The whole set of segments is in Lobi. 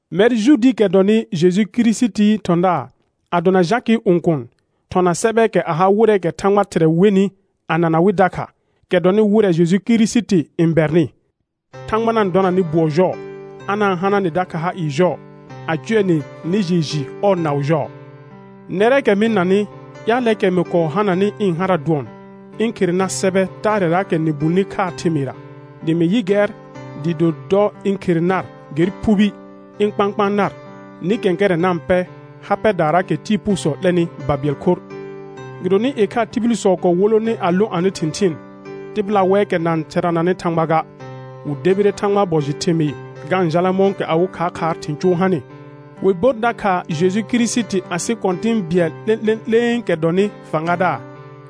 Mɛr Juudiikɛ dɔnɩ Jeju Kirisitii thɔ̃daar, a dona Jakɩɩ õkuun, thɔna sɛbɛɛkɛ a ha wɩrɛɛkɛ Thãgba Thɩrɛ wenɩ a na na wɩ dakha, kɛ dɔnɩ wɩrɛ Jeju Kirisiti n bɛrnɩ. Thãgba na-n dɔna nɩ bʋɔ jɔɔ, a na-n hana nɩ dakha ha ɩɩ jɔɔ, a cʋɛ nɩ nɩ jɩɩ jɩ ɔɔ naʋ jɔɔ. Nɛrɛɛkɛ mɩ-n nanɩ, ƴaalɛɛkɛ mɩ kɔɔ hananɩ ɩ̃ hara dʋɔn ɩ̃ khere nar sɛbɛ taarɛraakɛ sɩ bulni khaa thɩmɩɩra, dɩ mɩ yɩ gɛr dɩɩ do dɔ ɩ̃ khere nar ger phubi ɩ̃ kpãkpãa nar nɩ kɛ̃kɛrɛ̃ na-n pɛ ha pɛdaaraakɛ tɩɩ phuusɔ 'lɛnɩ babɩɛl khorr. Gɩdonɩ ɩkhaa tibilsɔ kɔɔ wolone a lõ anɩ thɩ̃thɩɩn; tɩbɩla wɛɛkɛ na-n therananɩ Thãgba ga, wɩ debire Thãgbaa bɔ jɩ thɩmɩɩ ga-n jala mɔ̃kɛ awɩ khaakhaar thɩ̃ cʋʋ hanɩ, wɩ bor dakha Jeju Kirisiti asɩ Kɔ̃tɩ̃ bɩɛl 'lẽ'lẽ'lẽekɛ dɔnɩ fãgadaar.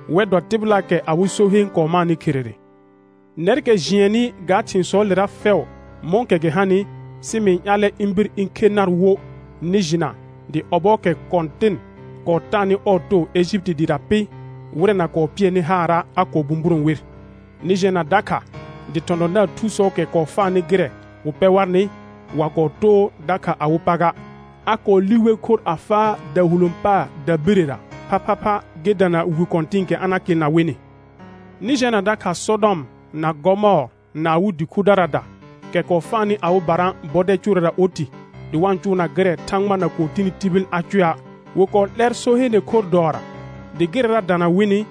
Wɛr dɔ tɩbɩlaakɛ awɩ so heen kɔɔ maanɩ kherere. Nɛrkɛ jɩɛnnɩ ga thɩ̃sɔɔlera fɛʋ mɔ̃kɛ gɩ hanɩ, sɩ mɩ-n ƴaalɛ ɩ̃ bir ɩ̃ khe nar wo nɩ jɩna dɩ ɔbɔɔkɛ Kɔ̃tɩn kɔɔ taanɩ ɔɔ too Ejipiti dɩɩra pɩ, wɩrɛ na kɔɔ pɩɛnɩ haara', a kɔɔ bũburõ wer. Nɩ jɛna dakha dɩ thɔ̃thɔ̃daar thusɔɔkɛ kɔɔ faanɩ gɩrɛ wɩ pɛ warnɩ, wa kɔɔ too dakha awɩ pa ga, a kɔɔ li wer khorr a faa dahulõ paar dabirəra, phaphapha gɩ dana wi kɔ̃tɩ̃ɩkɛ a na kɩɩlna wɩnɩ. Nɩ jɛna dakha Sɔdɔm na Gɔmɔɔr na awɩ dɩ khudaraada, kɛ kɔɔ faanɩ awɩbara bɔdɛl cʋʋrɛra oti, dɩ wa-n cʋʋna gɩrɛ Thãgba na kɔɔ tini tibil a cʋɛa'; wɩ kɔɔ 'lɛr so heene khorr dɔɔra, dɩ gɩrɛra dana wɩnɩ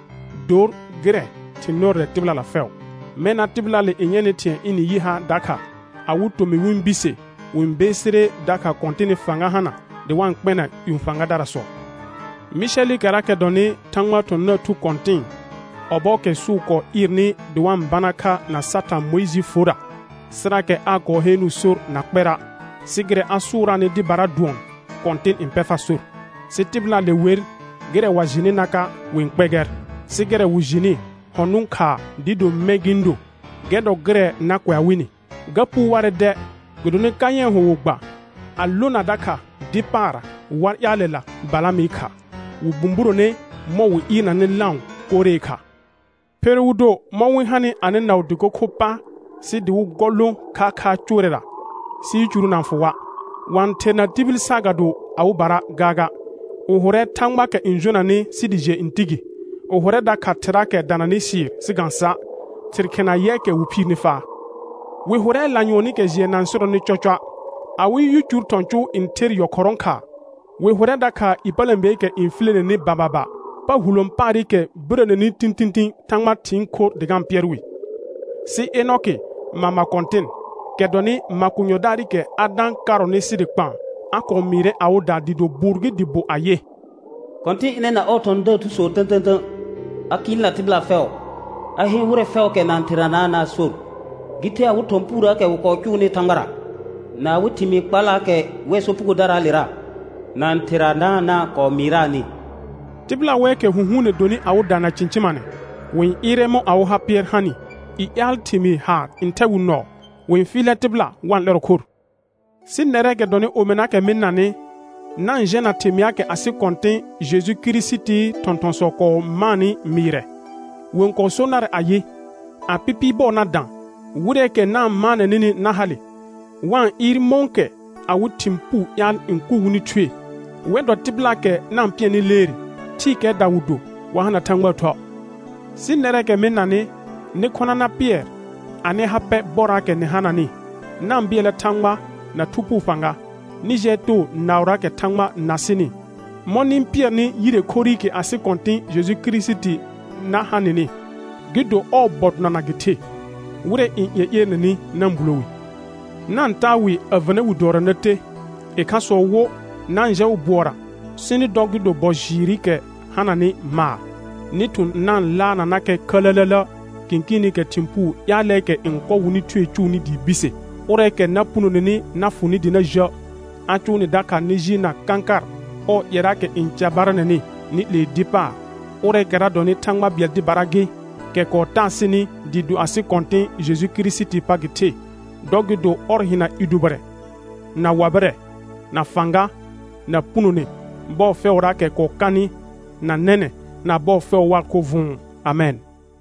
dor gɩrɛ thɩ̃ nɩrɔrɛ tɩbɩlala fɛʋ. Mɛna tɩbɩlaale n yɛnɩ thɩ̃ɛ ɩnɩ yɩ ha dakha, awɩ tomɩ wɩ-n bise, wɩ-n beesire dakha Kɔ̃tɩnɩ fãga hana dɩ wa-n kpɛna ƴũ fãgadarasɔ. Mɩsɛlɩkɛrakɛ dɔnɩ Thãgbaa thɔ̃thɔ̃daar thu kɔ̃tɩ̃ɩ, ɔbɔɔkɛ sʋʋ kɔɔ ɩɩrnɩ dɩ wa-n bana kha na Satã Mʋɩjɩɩ forra, sɩrakɛ aa kɔɔ heenuu sor na kpɛra', sɩ gɩrɛ a sʋʋraanɩ dɩbara dʋɔn: Kɔ̃tɩn n pɛ far sor. Sɩ tɩbɩlaale wer, gɩrɛ wa jɩnɩnaka' wɩ-n kpɛ gɛr, sɩ gɩrɛ wɩ jɩnɩ hɔ̃ nʋ̃ khaa dɩɩ do mɛ̃ gɩ-n do, gɛr dɔ gɩrɛ na kʋɛa wɩnɩ. Ga puu warɛ dɛ, gɩdonɩ Kayɛ̃ɛ hʋ wɩ gba a lona dakha dɩ paarra war ƴaalɛla Balamɩ kha, wɩ bũburone mɔ̃ wɩ ɩɩrnanɩ lãʋ Koree kha. Pheru wɩ do mɔ̃ wɩ-n hanɩ anɩ naʋ dɩko kho pa sɩ dɩ wɩ gɔ lõ khaakhaar cʋʋrɛra, sɩ yicuru na-n fʋ wa'; wa-n therna tibil saagado awɩbara gaaga. Wɩ hʋrɛ thãgbaakɛ n jonanɩ sɩ dɩ jɩɛ n ti gi; wɩ hʋrɛ dakha thɩraakɛ dananɩ sɩɩr sɩ ga-n sa'; thɩr khɩna yɛɛkɛ wɩ phiirni faa. Wɩ hʋrɛ lanyʋɔnɩkɛ jɩɛ na-n sɩrɔnɩ cɔcɔa', awɩ yicur thɔ̃ cʋʋ n ther yɔkhɔrɔ̃ khaa. Wɩ hʋrɛ dakha ƴepələ̃beekɛ n fileneni bababa; pa hulõ paarɩkɛ birəneni tĩtĩtĩ Thãgba thɩɩn khorr dɩ ga-n pɩɛr wɩ. Sɩ Enɔkɩ, mama kɔ̃tɩn, kɛ dɔnɩ makonyɔdaarɩkɛ Adã karɔnɩ sɩ dɩ kpaan, a kɔɔ mɩɩrɛ awɩda dɩɩ do bʋʋr gɩ dɩ bo ayɩ: «Kɔ̃tɩn ɩnɛ na ɔɔ thɔ̃thɔ̃daar thusɔ tə̃tə̃tə̃, a kɩɩlna tɩbɩla fɛʋ, a heen wɩrɛ fɛʋʋkɛ na-n theranaana' sor, gɩ the awɩ thɔ̃ puurəəkɛ wɩ kɔɔ cʋʋnɩ Thãgbara, na awɩ thɩmɩɩ kpallaakɛ wɛr sopugodaraalera na-n theranaana' kɔɔ mɩɩraanɩ.» Tɩbɩla wɛɛkɛ hũhuune donɩ awɩda na cɩ̃cɩmanɛ; wɩ-n ɩɩrɛ mɔ̃ awɩ ha pɩɛr hanɩ; i ƴaal thɩmɩɩ haar n thɛ wɩ nɔɔ; wɩ-n fɩɩlɛ tɩbɩla wa-n 'lɛrɔ khor. Sɩ nɛrɛɛkɛ dɔnɩ omɩnaakɛ mɩ-n nanɩ, na-n jɛna thɩmɩaakɛ asɩ Kɔ̃tɩ̃ Jeju Kirisitii thɔ̃thɔ̃sɔ kɔɔ maanɩ mɩɩrɛ. Wɩ-n kɔɔ so narɛ ayɩ: A pɩpɩɩ bɔɔ na dã, wɩrɛɛkɛ na-n maanɛ nɩnɩ na hale, wa-n ɩɩr mɔ̃kɛ awɩ thɩ̃ puu ƴaal n kʋ wɩnɩ thue. Wɛr dɔ tɩbɩlaakɛ na-n pɩɛrnɩ leere; thɩɩkɛɛda wɩ do, wa hana Thãgbaa Thuə'. Sɩ nɛrɛɛkɛ mɩ-n nanɩ, nɩ khɔna na pɩɛr anɩ ha pɛ bɔraakɛ nɩ hananɩ; na-n bɩɛlnɛ Thãgba na Thu Phuu fãga. Nɩ jɩɛ too naʋraakɛ Thãgba na sɩnɩ, mɔ̃ nɩ-n pɩɛrnɩ yire khorrɩkɛ asɩ Kɔ̃tɩ̃ Jeju Kirisiti na ha nɩnɩ, gɩ do ɔɔ bɔ donana gɩ the. Wɩrɛ n ƴeƴerenenɩ na-n bulo wi; na-n taa wɩ a vənə wi dɔɔra na te; ɩkhasɔ wo, na-n jɛ wɩ bʋɔra sɩ nɩ dɔ gɩ do bɔ jɩɩrɩkɛ hananɩ maar, nɩ thʋ̃ na-n laarnanakɛ khələlələ kɩ̃kɩɩnɩkɛ thɩ̃ puu ƴaalɛɛkɛ n kɔ wɩnɩ thue cʋʋnɩ dɩɩ bise. Ʋrɛɛkɛ na punoneni na fʋ nɩ dɩ na jə', a cʋʋ nɩ dakha nɩ jɩɩlna kãkar ɔɔ ƴɛraakɛ n carbaranɛnɩ, nɩ 'lee dɩ paar; ʋrɛɛkɛra dɔnɩ Thãgba bɩɛl dɩbara gɩ, kɛ kɔɔ taa sɩnɩ dɩɩ do asɩ Kɔ̃tɩ̃ Jeju Kirisitii pa gɩ the, dɔ gɩ do ɔr hɩna i dʋbɩrɛ, na wabɩrɛ, na fãga, na punone, bɔɔ fɛʋraakɛ kɔɔ kanɩ, na nɛnɛ̃, na bɔɔ fɛʋ waa khorr vʋ̃ʋ. Amɛn.